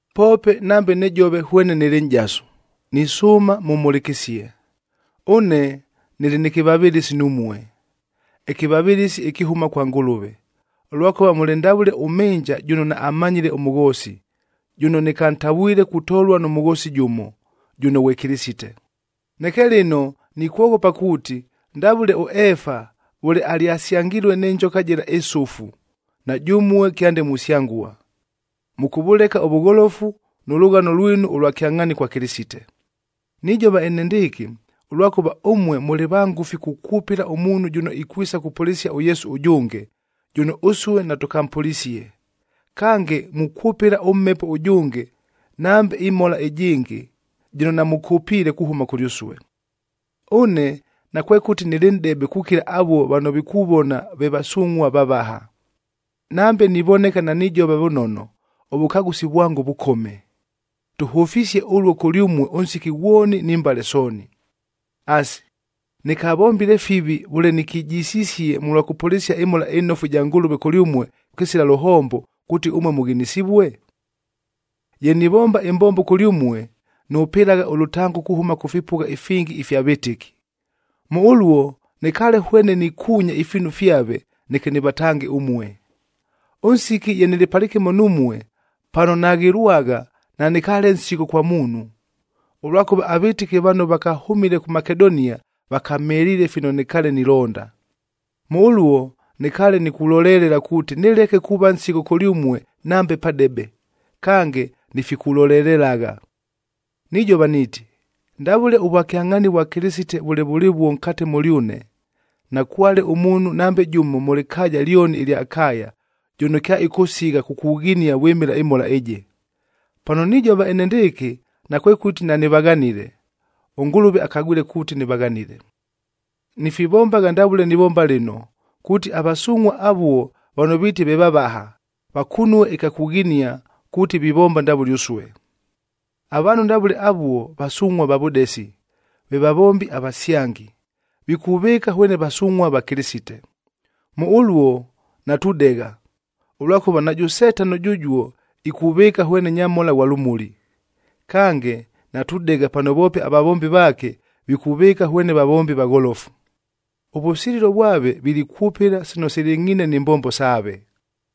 Poope nambe nijova hwene nɨlɨ nʼjasu, nisʉʉma mʉmhʉlɨkɨsie. Ʉne nɨlɨ nɨ kɨvavɨlɨsi numue, ɨkɨvavɨlɨsi ɨkɨhʉma kwa Ngʉlʉve, ʉlwakʉva mʉlɨ ndavʉle ʉmhɨnja jʉno naammanyile ʉmʉghoosi, jʉno nɨkantavwile kutolua nʉ mʉghoosi jʉmo, jʉno ghwe Kɨlɨsite. Neke lɨno nikwoghopa kuuti, ndavʉle ʉEefa vʉle alyasyangilue nɨ njoka jɨla ɨsʉfu, na jʉmue kyande musyangua, mʉkʉvʉleka ʉvʉgholofu nʉ lʉghano lwinu ʉlwa kyangʼhaani kwa Kɨlɨsite. Nijova enendɨɨkɨ, ʉlwakʉva ʉmue mʉlɨ vangʉfi kukwʉpɨla ʉmuunhu jʉno ikwisa kupʉlɨsia ʉYesu ʉjʉnge, jʉno ʉsue natʉkampʉlisie. Kange, mukwʉpɨla ʉmhepo ʉjʉnge nambe ɨmhola ɨjɨngɨ, jɨno namʉkʉpiile kuhʉma kʉlyʉsue. Ʉne nakwekʉti nɨlɨ nʼdebe kukila avuo vano vikuvona ve “vasungʼhua vavaha.” Nambe nivoneka nanijova vʉnono, ʉvʉkagʉsi vwango vʉkome. Tʉhʉfisie ʉluo kʉlyʉmue ʉnsiki ghwoni ni mbale sooni. Asi, nɨkavombile fivi vʉle nikijisisie mʉlwa kʉpʉlɨsia ɨMhola ɨNofu ɨja Ngʉlʉve kʉlyʉmue kɨsila lʉhombo, kuuti ʉmue mʉghinisivue? Ye nivomba ɨmbombo kʉlyʉmue, nʉpɨlagha ʉlʉtango kuhʉma kʉ fipʉgha ifingi ifya vɨtɨki. Mʉ ʉluo nɨkaale hwene nikuunya ifiinu fyave, neke nɨvatange ʉmue. Ʉnsiki ye nɨlɨ palɨkɨmo numue, pano naghɨlwagha nanɨkaale nsigho kwa muunhu, ʉlwakʉva avɨtɨki vano vakahʉmile kʉ Makedonia vakamheliile fino nɨkaale nilonda. Mʉ ʉluo, nɨkaale nikulolelela kuuti nɨleke kuuva nsigho kʉlyʉmue nambe padebe, kange nifikulolelelagha. Nijova niiti, ndavʉle ʉvwakyangʼhaani vwa Kɨlɨsite vʉle vʉlɨvuo nkate mʉlyʉne, nakwale ʉmuunhu nambe jʉmo mʉ lɨkaaja lyoni ɨlya Akaya, jʉno kyaɨkʉsigha kukughinia vwɨmɨla ɨmhola ɨjɨ. Pano nijova enendɨɨkɨ nakwekʉti nanɨvaghanile, ʉNgʉlʉve akagwile kuuti nɨvaghanile. Nifivombagha ndavʉle nivomba lɨno, kuuti avasungʼhua avuo vano viiti ve vavaha, vakunue ɨkya kughinia kuuti vivomba ndavʉle ʉsue. Avaanhu ndavʉle avuo vasungʼhua va vʉdesi, ve vavombi avasyangi, vikuvɨɨka hwene vasungʼhua va Kɨlɨsite. Mʉ ʉluo natudegha, ʉlwakʉva najʉ Setano jʉjuo ikuvɨɨka hwene nyamhola ghwa lʉmuli. Kange, natudegha pano voope avavombi vaake vikuvɨɨka hwene vavombi vagholofu. Ʉvʉsililo vwave vilikwʉpɨla sino silɨngʼhiine ni mbombo saave.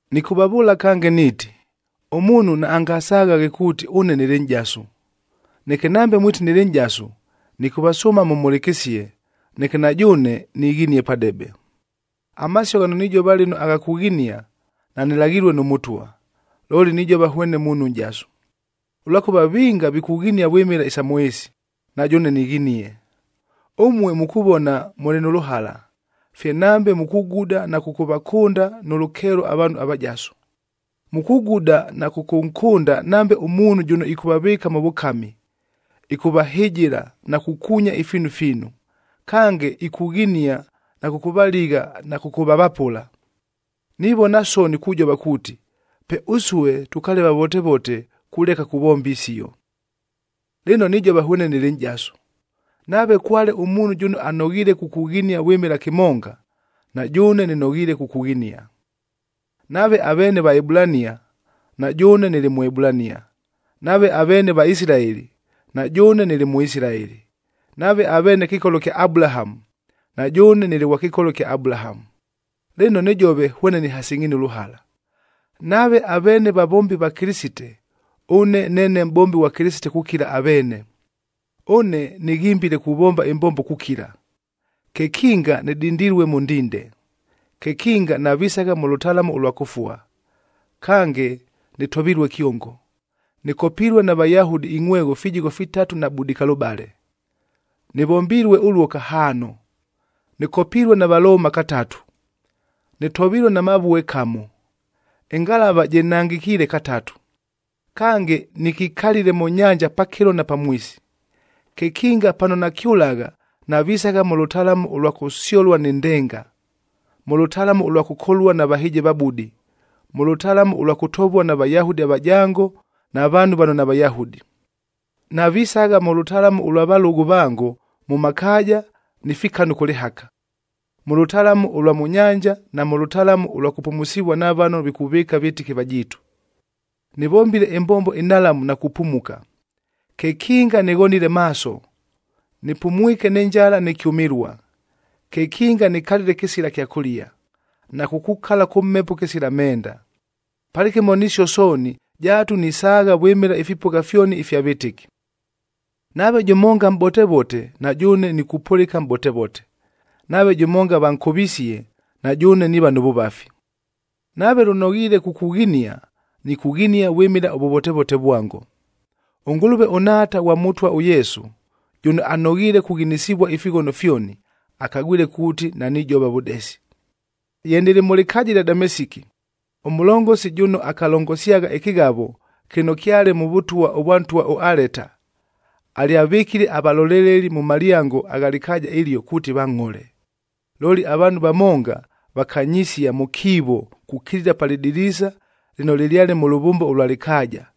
Nɨkʉvavʉʉla kange niiti, ʉmuunhu naangasaghaghe kuuti ʉne nɨlɨ nʼjasu! Neke nambe mwiti nɨlɨ nʼjasu, nɨkʉvasʉʉma mʉmhʉlɨkɨsie, neke na jʉʉne nighinie padebe. Amasio ghano nijova lɨno agha kughinia, nanɨlaghilue nʉ Mʉtwa, looli nijova hwene muunhu nʼjasu. Ʉlwakʉva vinga vikughinia vwɨmɨla isa mʉ ɨɨsi, na jʉʉne nighinie. Ʉmue mukuvona mʉlɨ nʉ lʉhala, fye nambe mukuguda na kʉkʉvakʉnda nʉ lʉkeelo avaanhu avajasu. Mukuguda na kʉkʉnkʉnda nambe ʉmuunhu jʉno ɨkʉvavɨɨka mʉ vʉkami, ɨkʉvahɨjɨla na kukuunya ifiinu fiinu, kange ikughinia na kʉkʉvaligha na kʉkʉvavapʉla. Nivona soni kujova kuuti, pe ʉsue tʉkaale vavotevote kuleka kuvomba isio. Lɨno nijova hwene nɨlɨ nʼjasu, nave kwale ʉmuunhu jʉno anoghiile kukughinia vwɨmɨla kɨmonga, na jʉʉne nɨnoghiile kukughinia. Nave aveene Vaebulania, na jʉʉne nɨlɨ Mʉebulania; nave aveene Vaisilaeli, na jʉʉne nɨlɨ Mʉisilaeli; nave aveene kɨkolo kya Abulahamu, na jʉʉne nɨlɨ ghwa kɨkolo kya Abulahamu. Lɨno nɨjove hwene nɨhasɨngʼhiine ʉlʉhala, nave aveene vavombi va Kɨlɨsite, ʉne neene mʼbombi ghwa Kɨlɨsite kukila aveene. Ʉne nɨghimbile kuvomba ɨmbombo kukila, kekinga nɨdindilue mʉ ndinde, kekinga navisagha mʉ lʉtalamu ʉlwa kʉfua, kange nɨtovilue kyongo. Nɨkopilue na Vayahudi ingʼhwegho fijigho fitatu na budikalʉbale, nɨvombilue ʉluo kahaano. Nɨkopilue na Valooma katatu, nɨtovilue na mavue kamo, ɨngalavaa jɨnangɨkiile katatu, kange nɨkikalile mʉ nyanja pakɨlo na pamwisi. Kekinga pano nakyʉlagha, navisagha mʉ lʉtalamu ʉlwa kʉsyolua ni ndenga, mʉ lʉtalamu ʉlwa kʉkolua na vahɨjɨvabudi, mʉ lʉtalamu ʉlwa kʉtovua na Vayahudi avajango na vaanhu vano naVayahudi. Navisagha mʉ lʉtalamu ʉlwa valʉgʉ vango mʉ makaaja ni fikanu kʉ lɨhaka, mʉ lʉtalamu ʉlwa mʉ nyanja na mʉ lʉtalamu ʉlwa kʉpumusivua na vano vikuvɨɨka vɨtɨki vajiitu. Nɨvombile ɨmbombo ɨnhalamu na kupumuka, kekinga nɨghonile maaso, nɨpumwike nɨ njala nɨ kyʉmɨlua, kekinga nikalile kɨsila kyakʉlia, na kukukala kʉ mhepo kɨsila menda. Palɨkɨmo nisio sooni, jaatu nisaagha vwɨmɨla ifipʉgha fyoni ifya vɨtɨki. Nave jʉmonga mʼbotevote, na jʉʉne nikupʉlɨka mʼbotevote; nave jʉmonga vankʉvisie, na jʉʉne niiva nʉ vʉvafi. Nave lʉnoghiile kukughinia, nikughinia vwɨmɨla ʉvʉvotevote vwango. ɄNgʉlʉve, ʉNhaata ghwa Mʉtwa ʉYesu, jʉno anoghiile kughinisivua ifighono fyoni, akagwile kuuti nanijova vʉdesi. Ye nɨlɨ mʉ lɨkaaja ɨlya Damesiki, ʉmʉlongosi jʉno akalongosyagha ɨkɨghavo kɨno kyale mʉ vʉtwa vwa ntwa ʉAleta, alyavɨkile avaloleleli mʉ malyango agha lɨkaaja ɨlio kuuti vangʼhole. Looli avaanhu vamonga vakanyisia mʉ kiivo kukilila pa lɨdiliisa lɨno lɨlyale mʉ lʉvʉmba ʉlwa lɨkaaja,